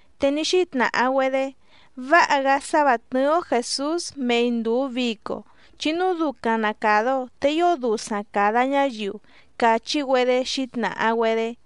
Te ní xítnàha‑güedé: —Váha‑gá sá vǎ tnɨ́ɨ́‑ó Jèsús mei ndùu vico, chi núu ducaⁿ na càda‑o te ío dusaⁿ càda ñáyiu —càchí‑güedé xǐtnàha‑güedé.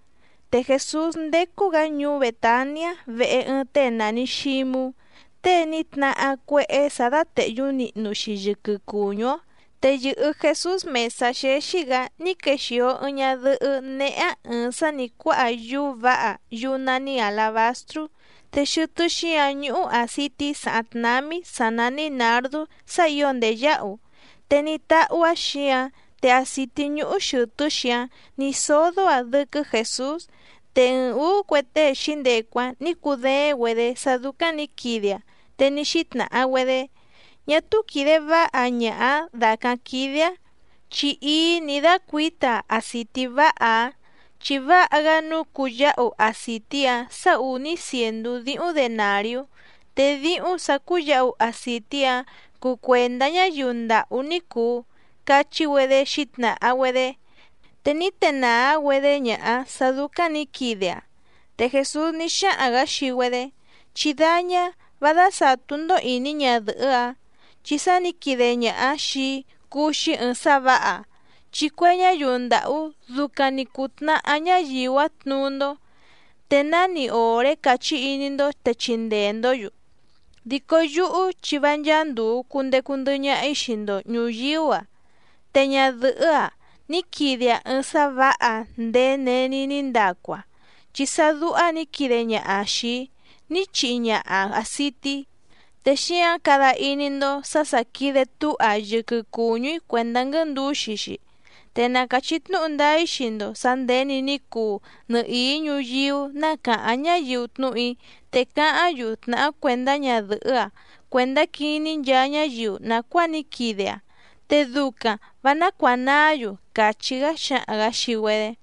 Te Jèsús ndécú‑gǎ ñuú Bètaniá vehe ɨɨⁿ tée nàni Xímú, tée ní tnahá cuéhé sǎ dátèhyú nihnu‑xi yɨquɨ cùñú‑ó. Te yɨ̀hɨ Jesús mèsá xéxí‑gǎ ní quexìo ɨɨⁿ ñadɨhɨ́ néhé‑áⁿ ɨ̀ɨⁿ sá nǐ cuáha yúú vǎha yúú nání àlabastrú, te xɨtɨ́ xíǎⁿ ñúhú àcití sàháⁿ tnámí sǎ nání nǎrdú sá ǐo ndèyáhu, te ní táhú‑áⁿ xǐǎⁿ te acìtí ñúhú xɨ̀tɨ́‑xi‑áⁿ nǐ sódó‑aⁿ dɨ́quɨ́ Jèsús. Te ɨɨⁿ ǔú cue tée xǐndecu‑áⁿ nǐ cudééⁿ‑güedě sá dúcáⁿ nǐ quide‑aⁿ, te ní xítnàha‑güedé: —Ñá túú quìde váha ñaha‑ǎⁿ dàcáⁿ quídé‑áⁿ, chi íí nǐ dácuǐta‑aⁿ acìtí váha‑ǎⁿ. Chi váha‑gá nǔu cuyáhu acìtí‑ǎⁿ sá ùní cièndú díhúⁿ denàriú, te díhúⁿ sǎ cúyǎhu acìtí‑ǎⁿ cuu cuèndá ñáyiu ndàhú ní cùu —cachí‑güedé xǐtnàha‑güedé. Te ní tenàá‑güedé ñaha‑áⁿ sǎ dúcáⁿ nǐ quide‑aⁿ. Te Jèsús ní xáhaⁿ‑gǎ xii‑güedé: —Chí dáñá, vá dásàtú‑ndó ìní ñadɨ̀hɨ́‑a, chi sá nǐ quide ñaha‑aⁿ xìi‑í cúú‑xí ɨ̀ɨⁿ sá vǎha. Chi cue ñáyiu ndàhú ducaⁿ‑ni cùtnahá ñáyiu‑áⁿ tnuú‑ndó, te náni òré càchí iní‑ndó te chindee‑ndǒ‑yu. Dico yúhú chi vá ncháá ndùu cundecu ndɨhɨ ñaha‑í xii‑ndo ñùyíú‑a. Te ñadɨ̀hɨ́‑a ní quide‑aⁿ ɨɨⁿ sá vǎha ndèé není ní ndacu‑aⁿ, chi sá dúhá nǐ quide ñaha‑aⁿ xìi‑í ní chihi ñaha‑aⁿ àcití, te xíǎⁿ cada iní‑ndó sǎ sà quide túha‑aⁿ yɨquɨ cùñú‑í cuèndá quɨ́ndúxi‑xi. Te na càchí tnúhu ndáá‑í xii‑ndo sǎ nděni ní cuu nɨhìí ñuyíú ná càháⁿ ñáyiu tnúhu‑í, te cáháⁿ‑yu tnàhá cuèndá ñadɨ̀hɨ́‑a cuèndá quiní nchaa ñáyiu nàcuáa ní quide‑aⁿ, te ducaⁿ vǎ nácuànaá‑yu —càchí‑gá xǎhaⁿ‑gǎ xii‑güedé.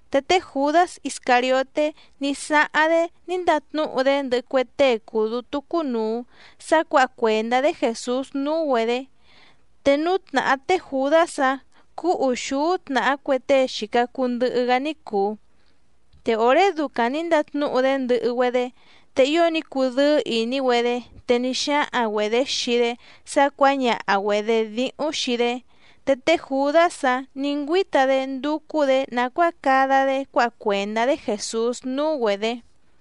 Te té Jùdás Iscàrioté ní sáháⁿ‑dé ní ndatnúhu‑dé ndɨhɨ cue tée cùu dútú cúnùu sá cuǎha cuèndá‑dé Jèsús núú‑güedě, te núú tnàhá té Jùdás‑áⁿ cúú ùxúú tnàhá cue tée xìca cuu ndɨhɨ‑gá ní cùu. Te òré ducaⁿ nǐ ndatnúhu‑dé ndɨhɨ‑güedé, te ío ní cudɨ́ɨ́ ìní‑güedé, te ní xáhaⁿ‑güedě xii‑dé sá cuǎñaha‑güedě díhúⁿ xii‑dé. Te té Jùdás‑áⁿ nǐ ngüíta‑dé ndúcú‑dě nàcuáa cada‑dé cuáha cuèndá‑dé Jèsús núú‑güedě.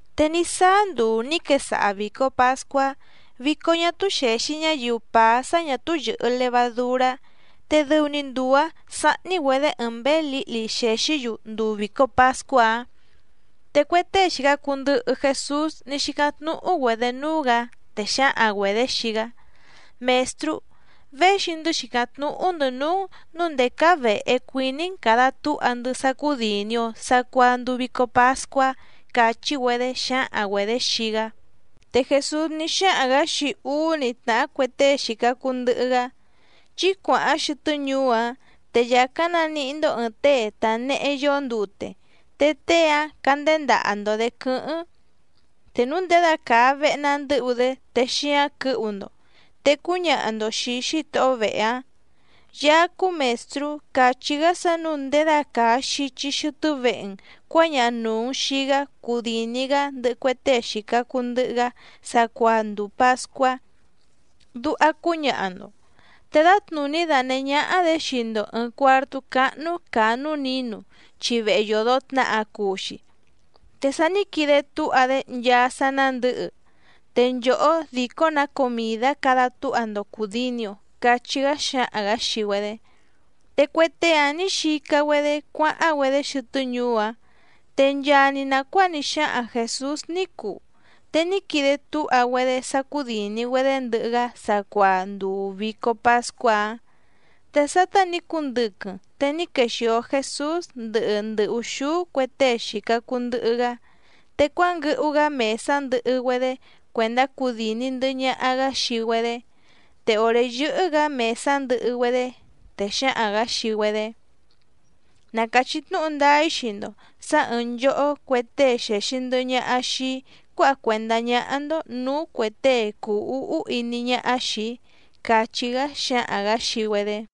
Te ní sáá nduu nǐ quesaha vìco pascuá, vico ñá túú xèxi ñáyiu pàá sá ñà túú yɨ̀hɨ levadurá, te dɨu‑ni nduu‑ǎⁿ sáhní‑güedě ɨɨⁿ mběé lǐhli xèxí‑yu nduu vìco pascuá‑áⁿ. Te cue tée xìca cuu ndɨhɨ Jesús ní xícáⁿ tnúhú‑güedě núú‑gǎ, te xǎhaⁿ‑güedě xii‑gá: —Mèstrú, véxi‑ndɨ́ xìcáⁿ tnúhú‑ndɨ̌ núú‑n nǔu ndèé cáá vèhe cuiní‑n càda túha‑ndɨ́ sá cúdìni‑o sacuaa nduu vico pascuá —càchí‑güedé xǎhaⁿ‑güedě xii‑gá. Te Jèsús ní xáhaⁿ‑gǎ xii úú‑ni tnàhá cue tée xìca cuu ndɨhɨ‑gá: —Chí cuàháⁿ xɨtɨ́ ñuú‑ǎⁿ, te yàcáⁿ naníhí‑ndó ɨ̀ɨⁿ tée tànehe yóó ndute, te tée‑áⁿ cánděndaha‑ndo‑dě quɨ́hɨ́ⁿ. Te núu ndědacàa vehe na ndɨ́hu‑dé te xíáⁿ quɨ̌hu‑ndo. Te cúñaha‑ndo xìi xítohó vehe‑áⁿ: “Yaá cúú Mèstrú càchí‑gá sá nǔu ndědacàa xichi xɨtɨ́ vehe‑n cuǎñaha nùu‑n xii‑gá cudìni‑gá ndɨhɨ cue tée xìca cuu ndɨhɨ‑gá sacuaa nduu pàscuá”, duha cúñaha‑ndo. Te dǎtnùní danèhé ñáhá‑dě xii‑ndo ɨ̀ɨⁿ cuartú cáhnú càa núú nǐnu, chi vehe yòdo tnaha cuu‑xi, te sa ní quide túha‑dé nchaa sá nándɨ̌hɨ, te nchòhó dìcó‑nǎ comìdá cada túha‑ndo cùdini‑o —cachí‑gá xǎhaⁿ‑gǎ xii‑güedé. Te cue tée‑áⁿ nǐ xica‑güedé cuáháⁿ‑güedé xɨtɨ́ ñuú‑áⁿ, te nchaa‑ni nàcuáa ní xáhaⁿ Jèsús ní cuu. Te ní quide túha‑güedé sá cúdìni‑güedé ndɨhɨ‑gá sacuaa nduu vìco pascuá‑áⁿ. Te sátá nǐ cundɨquɨⁿ te ní quexìo Jesús ndɨhɨ ndɨ ùxúú cue tée xìca cuu ndɨhɨ‑gá. Te cuánguɨhu‑gá mèsá ndɨhɨ‑güedé cuèndá cudìni ndɨhɨ ñaha‑gá xii‑güedé, te òré yɨ́hɨ́‑gǎ mèsá ndɨhɨ‑güedé, te xǎhaⁿ‑gǎ xii‑güedé: —Na càchí tnúhu ndáá‑í xii‑ndo sǎ ɨ̀ɨⁿ nchohó cue tée xèxi ndɨhɨ ñaha xii‑í cuáha cuèndá ñáhá‑ndó nǔú cuè tée cùu úhú iní ñáhá xìi‑í —càchí‑gá xǎhaⁿ‑gǎ xii‑güedé.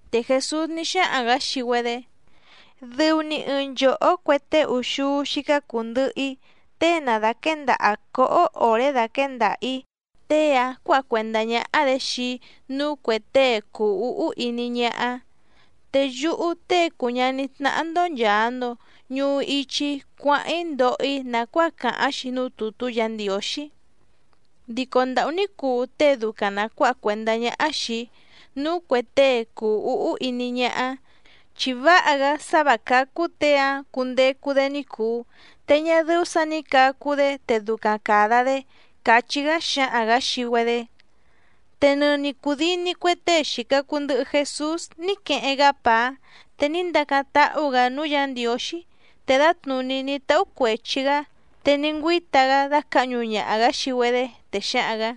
Te Jèsús ní xáhaⁿ‑gǎ xii‑güedé: —Dɨu‑ni ɨɨⁿ nchòhó cue tée úxúú xícá cùu ndɨhɨ‑í, tée na dàquéndaha cǒhó òré daquěndaha‑ǐ, tée‑áⁿ cuǎha cuèndá ñáhá‑dě xii‑í núú cuè tée cùu úhú iní ñáhá. Te yúhú Tée cùu ñaní tnáhá‑ndó nchàa‑ndo ñuhu ichi‑í cuáháⁿ‑í ndoho‑í nàcuáa càháⁿ‑xi núú tùtú Yǎ Ndiǒxí. Dico ndàhú ní cuu tée ducaⁿ na cuǎha cuèndá ñáhá xìi‑í núú cuè tée cùu úhú iní ñáhá, chi váha‑gá sá vǎ cácú těe‑áⁿ cundecu‑dé ní cùu, te ñá dɨ́ú sǎ nǐ cacu‑dé te ducaⁿ càda‑dé —càchí‑gá xǎhaⁿ‑gǎ xii‑güedé. Te nɨni cùdini cue tée xìca cuu ndɨhɨ Jesús ní queheⁿ‑gá pàá, te ní ndacáⁿ táhú‑gǎ núú Yǎ Ndiǒxí, te dǎtnùní ní táhú cuèchi‑gá, te ní ngüíta‑gá dácǎhñu ñaha‑gǎ xii‑güedé, te xǎhaⁿ‑gǎ: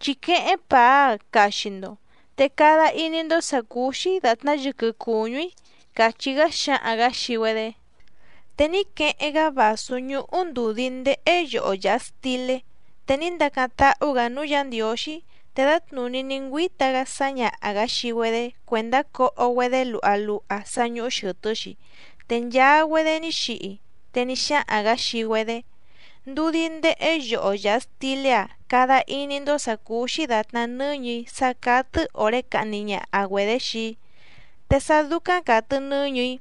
—Chí quéhéⁿ pàá‑a caxi‑ndo, te cada iní‑ndó sǎ cúú‑xí dàtná yɨquɨ cùñú‑í —càchí‑gá xǎhaⁿ‑gǎ xii‑güedé. Te ní queheⁿ‑gá vàsú ñúhú ndùdí ndéhé yoho yàha stilé, te ní ndacáⁿ táhú‑gǎ núú Yǎ Ndiǒxí, te dǎtnùní ní ngüíta‑gá sǎñaha‑gǎ xii‑güedé cuèndá coho‑güedé luha luha sá ñúhú xɨ̀tɨ́‑xi, te nchaa‑güedé ní xihi. Te ní xáhaⁿ‑gǎ xii‑güedé: —Ndudí ndéhé yoho yàha stilé‑a cada iní‑ndó sǎ cúú‑xí dàtná nɨ́ñɨ̀‑í sá cátɨ́ òré cahni ñaha‑güedě xii‑í. Te sá dúcáⁿ càtɨ nɨ́ñɨ̀‑í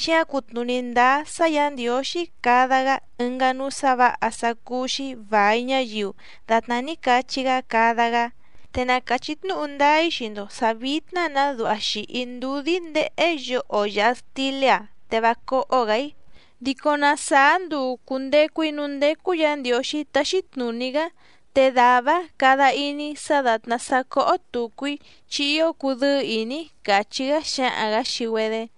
xíǎⁿ cutnùní ndáá sá Yǎ Ndiǒxí cada‑gá ɨngá núú sǎ vǎha sá cúú‑xí vài ñáyiu dàtná ní cachí‑gá cada‑gá. Te na càchí tnúhu ndáá‑í xii‑ndo sǎ vítná‑nǎ duha xìhi‑í ndudí ndéhé yoho yàha stilé‑a te vá cóhó‑gǎ‑í, dico na sàá nduu cùndecu‑í núú ndécú Yǎ Ndiǒxí táxí tnùní‑gá, te dàvá‑áⁿ cada iní‑í sá dàtná sá cóhó tùcu‑í chi ío cudɨ́ɨ́ ìní‑í —càchí‑gá xǎhaⁿ‑gǎ xii‑güedé.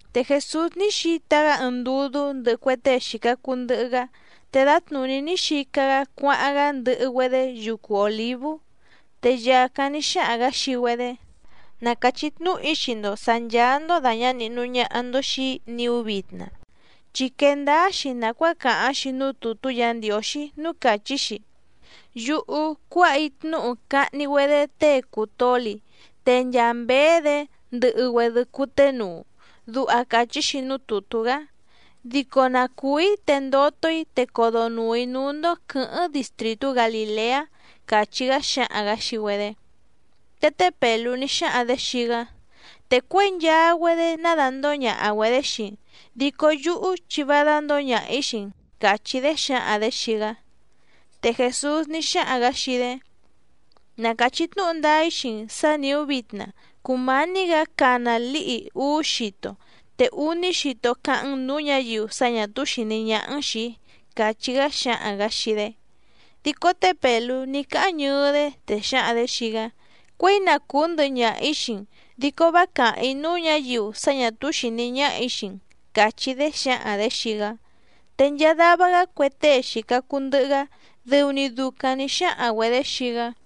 Te Jèsús ní xita‑gá ɨɨⁿ ndudú ndɨhɨ cue tée xìca cuu ndɨhɨ‑gá, te dǎtnùní ní xica‑gá cuáháⁿ‑gá ndɨhɨ‑güedé yucu Òlívú. Te yàcáⁿ ní xáhaⁿ‑gǎ xii‑güedé: —Na càchí tnúhu‑í xii‑ndo sǎ ncháá‑ndó dàña nihnu ñaha‑ndo xii‑í niú vitna, chi quee ndáá‑xi nàcuáa càháⁿ‑xi núú tùtú Yǎ Ndiǒxí núú càchí‑xi: “Yúhú cuáha‑í tnúhu cahni‑güedé tée cùu toli, te nchaa mběé‑dě ndɨhɨ‑güedɨ cuténuu”, duha càchí‑xi núú tùtú‑gá. Dico na cùú‑í te ndoto‑í te codonùu‑í núú‑ndó quɨ̌hɨ́ⁿ distrìtú Galìleá —càchí‑gá xǎhaⁿ‑gǎ xii‑güedé. Te té Pèlú ní xáhaⁿ‑dě xii‑gá: —Te cuěi nchaa‑güedé ná dàndóo ñaha‑güedě xii‑n, dico yúhú chi vá dándǒo ñaha‑ǐ xii‑n —càchí‑dé xǎhaⁿ‑dě xii‑gá. Te Jèsús ní xáhaⁿ‑gǎ xii‑dé: —Na càchí tnúhu ndáá‑í xii‑n sǎ nìú vitna cùmání‑gǎ cana lǐhi úú xito, te úní xito cáháⁿ‑n nǔú ñǎyiu sá ñà túú xìní ñáhá‑n xìi‑í —càchí‑gá xǎhaⁿ‑gǎ xii‑dé. Dico té Pèlú ní cáháⁿ ñɨɨ́‑dé, te xǎhaⁿ‑dě xii‑gá: —Cuěi na cùú ndɨhɨ ñaha‑ǐ xii‑n dico vá càháⁿ‑í núú ñǎyiu sá ñà túú xìní ñáhà‑í xii‑n —càchí‑dé xǎhaⁿ‑dě xii‑gá. Te nchaa dava‑gá cue tée xìca cuu ndɨhɨ‑gá dɨu‑ni ducaⁿ nǐ xáhaⁿ‑güedě xii‑gá.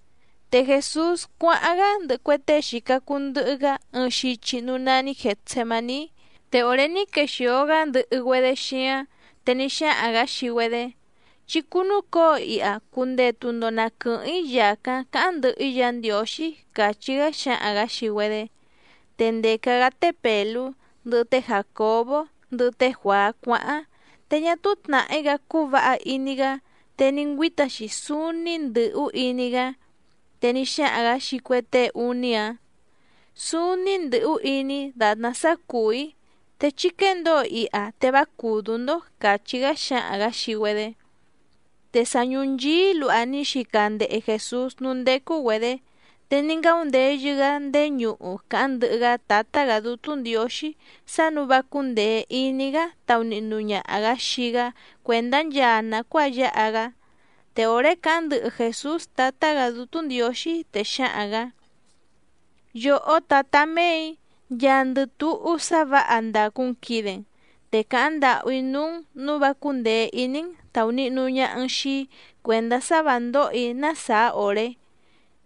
Te Jèsús cuáháⁿ‑gá ndɨhɨ cue tée xìca cuu ndɨhɨ‑gá ɨɨⁿ xichi núú nání Gètsemaní. Te òré ní quexìo‑gá ndɨhɨ‑güedé xíáⁿ, te ní xáhaⁿ‑gǎ xii‑güedé: —Chí cúnúcǒo iha cundetu‑ndo na quɨ̀hɨ́ⁿ‑í yàcáⁿ cáháⁿ ndɨhɨ‑í Yǎ Ndiǒxí —càchí‑gá xǎhaⁿ‑gǎ xii‑güedé. Te ndèca‑gá té Pèlú, ndɨhɨ té Jàcobó, ndɨhɨ té Juàá cuáháⁿ, te ñá túú tnàhí‑gá cúú vǎha iní‑gá te ní ngüíta‑xi súúní ndɨ̀hú iní‑gá. Te ní xáhaⁿ‑gǎ xii cue tée úní‑áⁿ: —Súúní ndɨ̀hú iní‑í dàtná sá cùú‑í, te chí quéndǒo iha te vá cùdú‑ndó —càchí‑gá xǎhaⁿ‑gǎ xii‑güedé. Te sa ñùnchií luha ní xica ndehe Jèsús núú ndécú‑güedě, te ní ngáundeyɨ‑gá ndéé ñuhu càháⁿ ndɨhɨ‑gá Tǎtá‑gǎ Dútú Ndiǒxí sá nǔu vá cúndèe iní‑gá taunihnu ñaha‑gǎ xii‑gá cuèndá nchaa nàcuáa yáha‑gá. Te òré càháⁿ ndɨhɨ Jèsús Tǎtá‑gǎ Dútú Ndiǒxí, te xǎhaⁿ‑gǎ: —Yòhó tǎtá méè‑í, nchaandɨ túhú sá vǎha ndàcu‑n quide‑n, te càháⁿ ndàhú‑í núú‑n nǔu vá cúndèe iní‑n tàunihnu ñaha‑n xii‑í cuèndá sá vǎ ndóhò‑í ná sàá òré,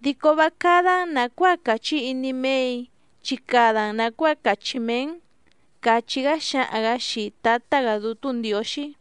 dico vá cádá‑n nàcuáa càchí iní méè‑í chi cada‑n nàcuáa càchí mee‑n —càchí‑gá xǎhaⁿ‑gǎ xii Tǎtá‑gǎ Dútú Ndiǒxí.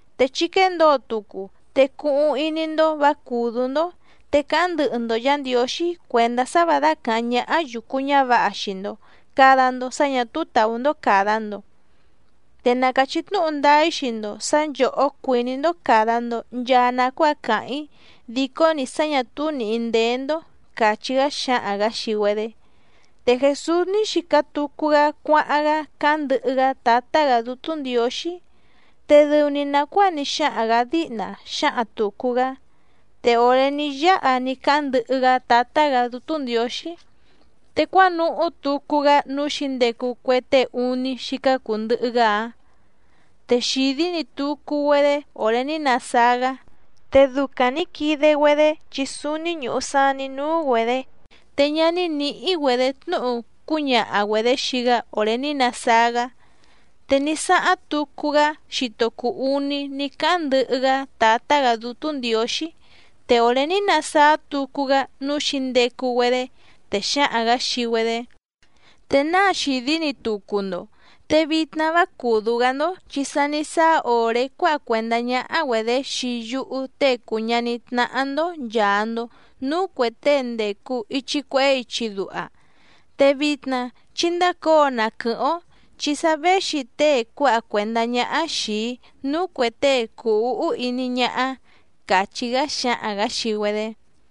—Te chí quéndǒo tucu, te cuhuⁿ iní‑ndó vǎ cùdú‑ndó, te cáháⁿ ndɨhɨ‑ndo Yǎ Ndiǒxí cuèndá sá vǎ dácàháⁿ ñáhá yùcu ñávǎha xii‑ndo càda‑ndo sá ñà túú tàú‑ndó càda‑ndo. Te na càchí tnúhu ndáá‑í xii‑ndo sǎ nchòhó cuìní‑ndó càda‑ndo nchaa nacuáa càháⁿ‑í dìcó‑ni sá ñà túú nìhí ndéé‑ndó —càchí‑gá xǎhaⁿ‑gǎ xii‑güedé. Te Jèsús ní xica tucu‑gá cuáháⁿ‑gá cáháⁿ ndɨhɨ‑gá Tǎtá‑gǎ Dútú Ndiǒxí, te dɨu‑ni nàcuáa ní xáhaⁿ‑gǎ díhna xǎhaⁿ tùcu‑gá. Te òré ní yáha ní cáháⁿ ndɨhɨ‑gá Tǎtá‑gǎ Dútú Ndiǒxí, te cuánuhú tucu‑gá núú xǐndecu cue tée úní xícá cùu ndɨhɨ‑gá‑áⁿ, te xìdí‑ni tucu‑güedé òré ní nasáá‑gá, te ducaⁿ nǐ quide‑güedé chi súúní ñùhu saní núú‑güedě, te ñá ní nǐhí‑güedě tnúhu cúñaha‑güedě xii‑gá òré ní nasáá‑gá. Te ní sáháⁿ tucu‑gá xito cùu uní ní cáháⁿ ndɨhɨ‑gá Tǎtá‑gǎ Dútú Ndiǒxí, te òré ní nasáá tucu‑gá núú xǐndecu‑güedé, te xǎhaⁿ‑gǎ xii‑güedé: —¿Te náa xìdí‑ni tucu‑ndo?, te vitna vá cùdú‑gá‑ndó chi sa ní sáá òré cuáha cuèndá ñáhá‑güedě xii yúhú Tée cùu ñaní tnáhá‑ndó nchàa‑ndo núú cuè tée ndècu ichi cuehé ichi duha. Te vitna chí ndácǒo na quɨ̀hɨ́ⁿ‑ó chi sa véxi tée cuáha cuèndá ñáhá xìi‑í núú cuè tée cùu úhú iní ñáhá —càchí‑gá xǎhaⁿ‑gǎ xii‑güedé.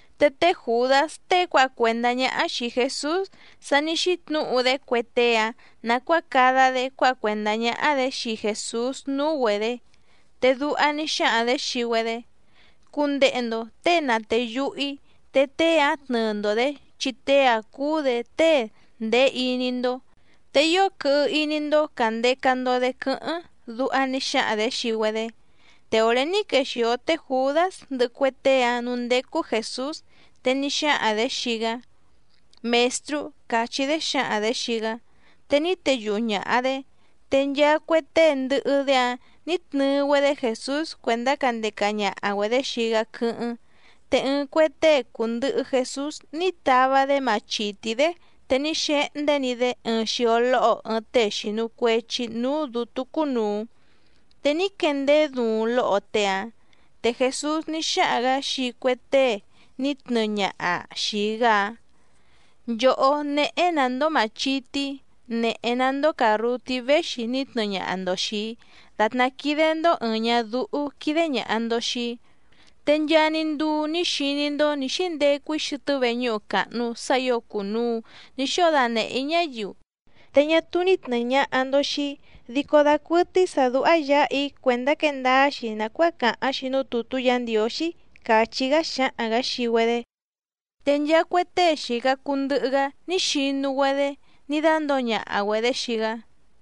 Te té Jùdás tée cuáha cuèndá ñáhá xìi Jesús sa ní xítnǔhu‑dé cue tée‑áⁿ nàcuáa cada‑dé cuáha cuèndá ñáhá‑dě xii Jèsús núú‑güedě. Te duha ní xáhaⁿ‑dě xii‑güedé: —Cundehe‑ndo těe na tèyuhu‑í, te tée‑áⁿ tnɨɨ‑ndo‑dě chi tée‑áⁿ cúú‑dě tée ndèé iní‑ndó, te ío quɨhɨ iní‑ndó càndeca‑ndo‑dé quɨ́hɨ́ⁿ —duha ní xáhaⁿ‑dě xii‑güedé. Te òré ní quexìo té Jùdás ndɨhɨ cue tée‑áⁿ nǔú ndécú Jèsús, te ní xáhaⁿ‑dě xii‑gá: —Mèstrú —càchí‑dé xǎhaⁿ‑dě xii‑gá. Te ní teyuhu ñàha‑dé. Te nchaa cue tée ndɨhɨ‑dé‑áⁿ nǐ tnɨɨ‑güedé Jèsús cuèndá candeca ñaha‑güedě xii‑gá quɨ́hɨ́ⁿ. Te ɨɨⁿ cue tée cùndɨhɨ Jesús ní tava‑dé machìtí‑dé, te ní xehndé‑ni‑dé ɨɨⁿ xio lóho ɨɨⁿ tée xìnu cuechi núú dǔtú cúnùu, te ní quendeé duuⁿ lóho tée‑áⁿ. Te Jèsús ní xáhaⁿ‑gǎ xii cue tée ní tnɨɨ ñaha xìi‑gá‑áⁿ: —Nchòhó, nèhe‑ná‑ndó màchití, nèhe‑ná‑ndó càrrutí véxi ní tnɨɨ ñaha‑ndo xìi‑í, dàtná quídé‑ndó ɨ̀ɨⁿ ñadúhú quídé ñàha‑ndo xii‑í. Te nchaa‑ni nduu ní xiní‑ndó nǐ xíndecu‑í xɨtɨ́ veñúhu càhnu sá ǐo cùnuu ní xóo danèhé‑í ñáyiu, te ñá túú ní tnɨ̀ɨ ñaha‑ndo xii‑í. Dico dàcuɨtɨ́í sǎ dúhá yǎha‑í cuèndá quee ndáá‑xi nàcuáa càháⁿ‑xi núú tùtú Yǎ Ndiǒxí —càchí‑gá xǎhaⁿ‑gǎ xii‑güedé. Te nchaa cue tée xìca cuu ndɨhɨ‑gá ní xinu‑güedé ní dándǒo ñaha‑güedě xii‑gá.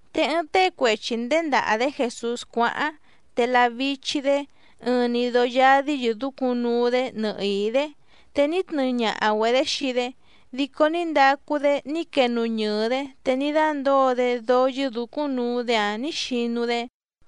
Te ɨɨⁿ tée cuechi nděndaha‑dě Jèsús cuáháⁿ, te lavichi‑dě, ɨɨⁿ‑ni dóó yádí yɨ̀dúcúⁿ nuu‑dé nɨhìí‑dé, te ní tnɨɨ ñaha‑güedě xii‑dé, dico ní ndacu‑dé ní quenuñɨɨ‑dě te ní dándǒo‑dé dóó yɨ́dǔcúⁿ nuu‑dé‑áⁿ nǐ xinu‑dé.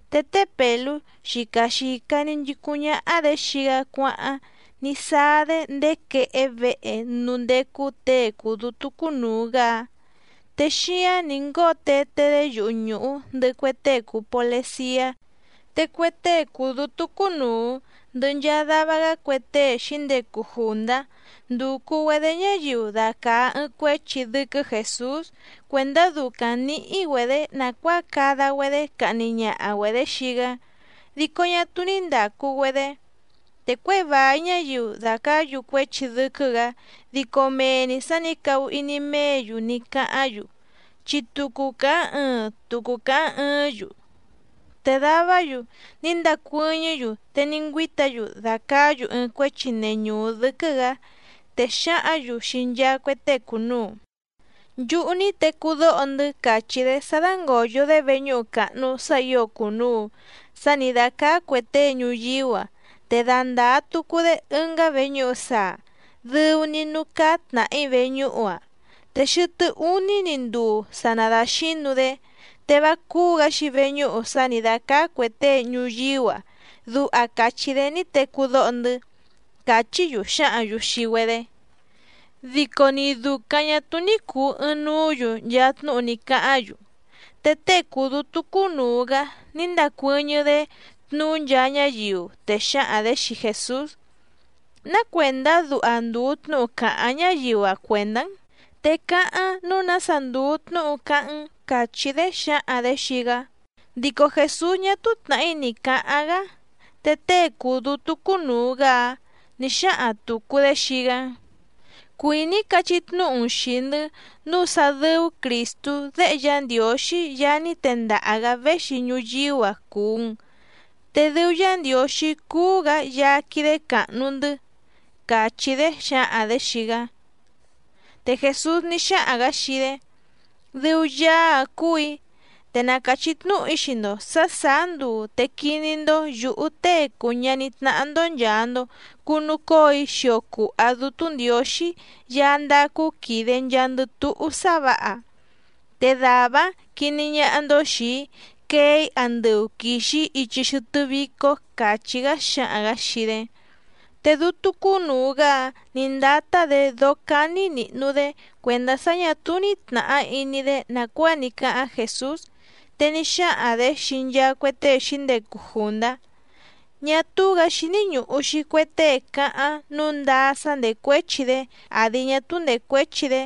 Te té Pèlú xica xìca‑ni nchicúⁿ ñáhá‑dě xii‑gá cuáháⁿ ní sáá‑dé ndéé quehé vehe núú ndécú těe cùu dútú cúnùu‑gá‑áⁿ, te xíáⁿ nǐ ngóo teté‑dé yuhu nùhú ndɨhɨ cue tée cùu poleciá. Te cue tée cùu dútú cúnùu ndɨhɨ nchaa dava‑gá cue tée xǐndecu jùndá ndúcú‑güedě ñáyiu dacàa ɨɨⁿ cuéchi dɨ́quɨ́ Jèsús cuèndá ducaⁿ nǐhí‑güedě nàcuáa cada‑güedé cahni ñaha‑güedě xii‑gá, dico ñá túú ní ndàcu‑güedé. Te cuěi vài ñáyiu dàcaá‑yu cuéchi dɨ́quɨ́‑gǎ dico mee‑ni sǎ nǐ cahu iní méě‑yu ní cáháⁿ‑yu, chi tucu càháⁿ ɨɨⁿ tucu càháⁿ ɨɨ́ⁿ‑yu. Te davá‑yu ní ndacuɨ́ñɨ́‑yu te ní ngüíta‑yu dàcaá‑yu ɨɨⁿ cuéchi neñùú dɨ́quɨ́‑gǎ, te xǎhǎⁿ‑yu xii nchaa cue tée cùnuu: —Nchúhú ní tecú dóho‑ndɨ́ càchí‑dé sá dángòyo‑dé veñúhu càhnu sá ǐo cùnuu sá nǐ dácáá cuè tée ñuyíú‑a, te dandàa tucu‑dé ɨngá veñúhu saa, dɨu‑ni núú cáá tnàhí veñúhu‑áⁿ te xɨtɨ́ úní‑ni nduu sa nadaxǐnu‑dé, te vá cúú‑gǎ‑xi veñúhu sá nǐ dácáá cuè tée ñuyíú‑a, duha càchí‑dé ní tecú dóho‑ndɨ́ —càchí‑yu xǎhǎⁿ‑yu xii‑güedé. Dico ni dùcaⁿ ñá túú ní cùu ɨɨⁿnuú‑yu nchaa tnúhu ní cáháⁿ‑yu. Te tée cùu dútú cúnùu‑gá ní ndacuɨ́ñɨ́‑dé tnuú nchaa ñáyiu, te xǎhaⁿ‑dě xii Jèsús: —¿Ná cuèndá duha ndùu tnúhu càháⁿ ñáyiu‑a cuèndá‑n? Te cáháⁿ nǔu nása ndùu tnúhu cáháⁿ‑n —càchí‑dé xǎhaⁿ‑dě xii‑gá. Dico Jèsús ñá túú tnàhí ni cǎháⁿ‑gá. Te tée cùu dútú cúnùu‑gá‑áⁿ nǐ xáhaⁿ tùcu‑dé xii‑gá: —Cuìní‑í cachí tnúhu‑n xìi‑ndɨ́ nǔu sá dɨ́ú Crìstú Déhe Yá Ndiǒxí Yaá ní tendaha‑gǎ véxi ñuyíú‑a cùu‑n. Te dɨu Yá Ndiǒxí cúú‑gǎ Yaá quídé càhnu‑ndɨ́ —càchí‑dé xǎhaⁿ‑dě xii‑gá. Te Jèsús ní xáhaⁿ‑gǎ xii‑dé: —Dɨu Yaá‑áⁿ cúù‑í, te na càchí tnúhu‑í xii‑ndo sǎ sàá nduu te quiní‑ndó yǔhú Tée cùu ñaní tnáhá‑ndó nchàa‑ndo cunucóo‑í xio cùha Dútú Ndiǒxí Yaá ndácú quìde nchaandɨ túhú sá vǎha. Te dàvá‑áⁿ quiní ñáhá‑ndó xìi‑í quee‑í andɨu quìxi‑í ichi xɨtɨ́ vícó —càchí‑gá xǎhaⁿ‑gǎ xii‑dé. Te dútú cúnùu‑gá‑áⁿ nǐ ndátá‑dě dóó cání nìhnu‑dé cuèndá sá ñà túú ní tnàhá iní‑dé nàcuáa ní cáháⁿ Jèsús, te ní xáhaⁿ‑dě xii nchaa cue tée xǐndecu jùndá: —Ñá túú‑gǎ xíní ñùhu‑xi cue tée cáháⁿ nǔu ndáá sá ndècuéchi‑dé àdi ñá túú ndècuéchi‑dé.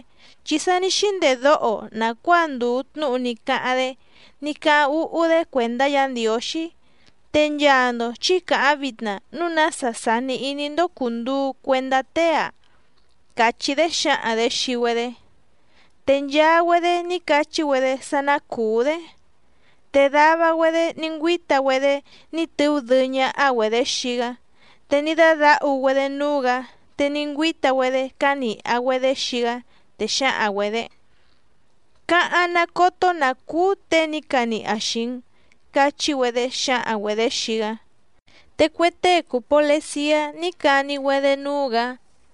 Chi sa ní xíndedóho‑o nàcuáa ndùu tnúhu ní cáháⁿ‑dé ní cáháⁿ úhú‑dé cuèndá Yǎ Ndiǒxí, te nchaa‑ndo chǐ càháⁿ vitna núu nása sàni iní‑ndó cùnduu cuendá tée‑a —càchí‑dé xǎhaⁿ‑dě xii‑í‑güedé. Te nchaa‑güedé ní cachí‑güedé sá ná cùú‑dé. Te dava‑güedé ní ngüíta‑güedé ní tɨú dɨɨ́ ñáhá‑güedě xii‑gá, te ní dádǎhu‑güedé núú‑gǎ, te ní ngüíta‑güedé cánìha‑güedé xii‑gá, te xǎhaⁿ‑güedě: —¡Cáháⁿ ná cótó nǎ cúú těe ní caniha xìi‑n! —cachí‑güedé xǎhaⁿ‑güedě xii‑gá. Te cue tée cùu poleciá ní cani‑güedé núú‑gǎ.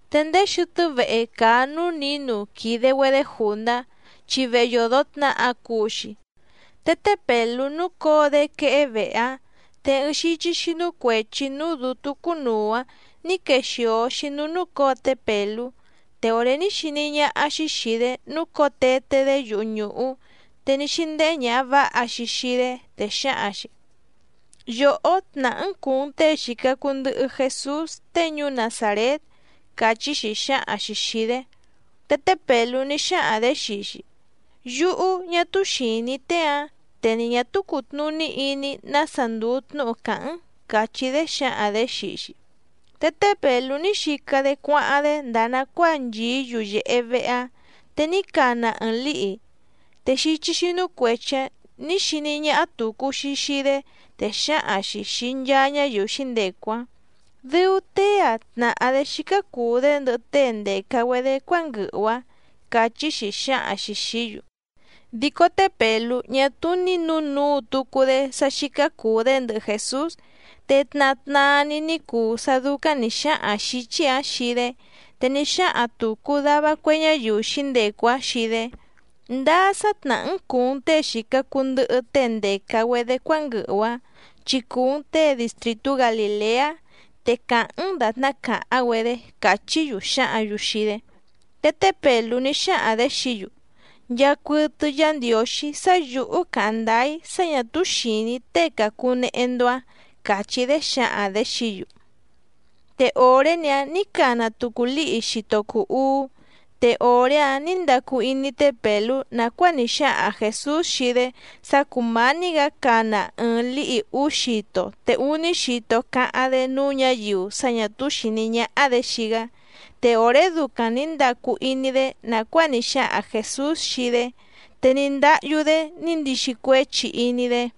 Te ndéé xɨtɨ́ vehe càa núú nǐnu quìde‑güedé jùndá, chi vehe yòdo tnaha cuu‑xi, te té Pèlú núcǒo‑dé quehé vehe‑áⁿ. Te ɨɨⁿ xíchí xínú cuèchi núú dǔtú cúnùu‑áⁿ nǐ quexìo‑xi núú núcǒo té Pèlú. Te òré ní xiní ñáhá‑xí xìi‑dé núcǒo teté‑dé yuhu nùhú, te ní xíndéhé ñàha váha‑xi xii‑dé, te xǎhaⁿ‑xi: —Yòhó tnàhá‑n cùu‑n tée xìca cuu ndɨhɨ Jesús tée ñuú Nazàrét —càchí‑xi xǎhaⁿ‑xi xìi‑dé. Te té Pèlú ní xáhaⁿ‑dě xii‑xi: —Yúhú ñá túú xìní‑í tée‑ǎⁿ, te ni ñà túú cùtnuní iní‑í nása ndùu tnúhu càháⁿ‑n —càchí‑dé xǎhaⁿ‑dě xii‑xi. Te té Pèlú ní xica‑dé cuáháⁿ‑dé ndàa nacuáa nchìí yuyèhe vehe‑áⁿ, te ní cana ɨɨⁿ lǐhi. Te xíchí xínú cuèchi‑áⁿ nǐ xiní ñáhá tùcu‑xi xii‑dé, te xǎhaⁿ‑xi xìi nchaa ñáyiu xǐndecu‑áⁿ: —Dɨu tée‑ǎⁿ tnàhá‑dé xícá cùu‑dé ndɨhɨ tée ndèca‑güedé cuánguɨhu‑a —càchí‑xi xǎhaⁿ‑xi xìí‑yu. Dico té Pèlú ñá túú ní nǔnuu tucu‑dé sá xícá cùu‑dé ndɨhɨ Jèsús. Te tna tnaa‑ni ní cuu sá dúcáⁿ nǐ xáhaⁿ xǐchí‑ǎⁿ xii‑dé, te ní xáhaⁿ tùcu dava cue ñáyiu xǐndecu‑áⁿ xii‑dé: —Ndáá sá tnàhá‑n cùu‑n tée xìca cuu ndɨhɨ tée ndèca‑güedé cuánguɨhu‑ǎⁿ chi cùu‑n tée distrìtú Galìleá, te càháⁿ‑n dàtná càháⁿ‑güedé —càchí‑yu xǎhǎⁿ‑yu xii‑dé. Te té Pèlú ní xáhaⁿ‑dě xií‑yu: —Nchàcuɨtɨ Yá Ndiǒxí sá yǔhú càháⁿ ndáá‑í sá ñà túú xìní‑í tée càcunehe‑ndo‑áⁿ —càchí‑dé xǎhaⁿ‑dě xií‑yu. Te òré‑ni‑áⁿ nǐ cana tucu lǐhi xito cùu uú, te òré‑áⁿ nǐ ndacu iní té Pèlú nàcuáa ní xáhaⁿ Jèsús xii‑dé sá cùmání‑gǎ cana ɨɨⁿ lǐhi úú xito te úní xito cáháⁿ‑dé núú ñǎyiu sá ñà túú xìní ñáhá‑dě xii‑gá. Te òré ducaⁿ nǐ ndacu iní‑dé nàcuáa ní xáhaⁿ Jèsús xii‑dé, te ní ndáhyú‑dé ní ndixi cuéchi iní‑dé.